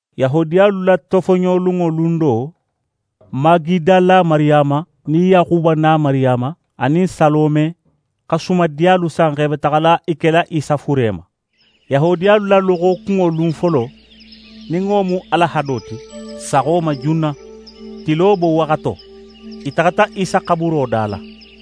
Yahudiyalu la tofoɲolunŋo lun do, Magidala Mariyama, nin Yaxuba na Mariyama, anin Salome xa sumadiyalu san x'e be taxala i kela Isa fure ma. Yahudiyalu la loxokunŋo lun folo, nin wo mu alahado ti, saxo ma junna, tilo bowaxato, i taxata Isa xaburo da la.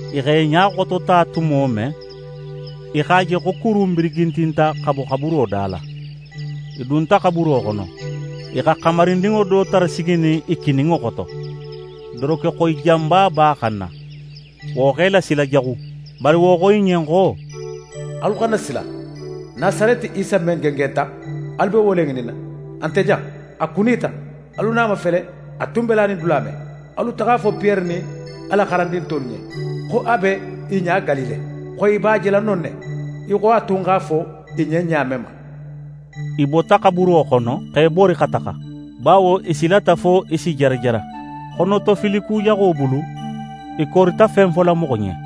I x'e ɲa xotota tumo men, i x'a je xo kuru in birigintinta, xa bo xaburo da la. I dunta xaburo xono. I xa xamarindinŋo do tara siginin i kininŋo xoto, dorokexoyi janba b'a xanna. Wo x'e lasila jaxu. Bari wo xo i ɲen xo: «Alu xana sila! Nasareti Isa men gengenta, alu be wo le ŋininna. A nte jan, a kunita! Alu na a mafele, a tun be lanin dula men! Alu taxa a fo Piyere nin a la xarandin tolu ɲen, xo a be i ɲa Galile, xo i b'a jela non ne, í xo a tun x'a fo i ɲen ɲa men ma.» I bota xaburo xono, x'e bori xa taxa, bawo i silata fo i si jarajara. Xonotofili kujaxo bulu, i korita fen fola moxo ɲen. [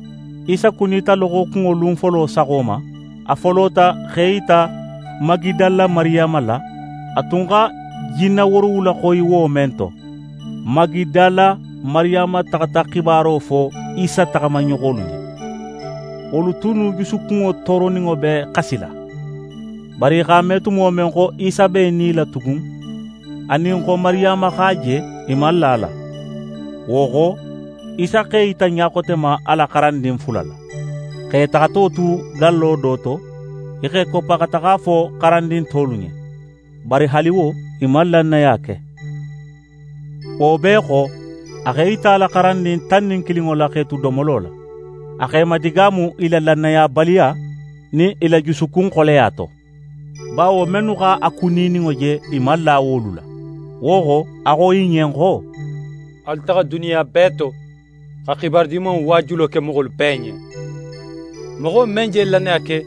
Isa kunita loxokunŋo lun folo saxo ma. A folota x'é yita Magidala Mariyama la, a tun xa jinne woorowula xoyi wo men to. Magidala Mariyama taxata xibaro fo Isa taxamaɲoxolu ɲen. Wolu tunnu jusukunŋo tooroninŋo be xasila. Bari i x'a me tumo men xo Isa b'é nila tugun, anin xo Mariyama x'a je, i man la a la. Wo xo, Isa x'é yita ɲa xote ma, a la xarandin fula la, x'e taxato tu gallo do to. I x'e koppa, xa taxa a fo xarandin tolu ɲen. Bari haali wo, i man lannaya ke. Wo bee xo, a x'é yita a la xarandin tan nin kilinŋo la x'e tu domolo la. A x'e madigaamu i la lannayabaliya nin i la jusukunxoleya to; bawo mennu x'a kunininŋo je, i man la wolu la. Wo xo, a xo i ɲen xo: «Alu taxa duniya bee to, xa xibaru Dimanŋo waajulo ke moxolu bee ɲen. Moxo men je lannaya ke,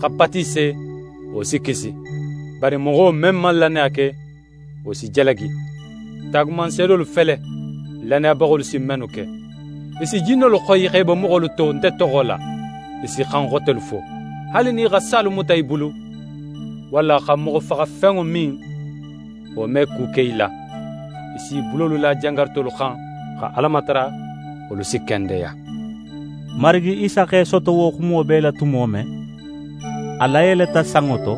xa batise, wo si kisi. Bari moxo men man lannaya ke, wo si jalagi. Taagumanseedolu fele, lannayabaxolu si mennu ke: I si jinnolu xoyi x'e bo moxolu to nte toxo la, i si xan xotelu fo. Haali nin i xa salu muta i bulu, walla xa moxofaxafenŋo min, wo me ku ke i la. I s'i bulolu la jangarutolu xan, xa Ala matara, wolu si kendeya.» Marigi Isa x'é soto wo xumo bee la tumo men, a layeleta sanŋo to,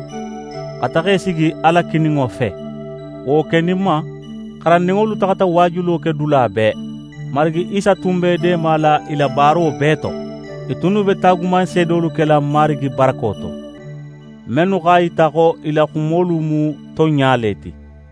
xa taxa í sigi Ala kininŋo fe. Wo keninma, xarandinŋolu taxata waajulo ke dula bee. Marigi Isa tun be i deemala i la baaro bee to. I tunnu be taagumanseedolu kela Marigi barako to, mennu x'a yita xo i la xumolu mu tonɲa le ti.]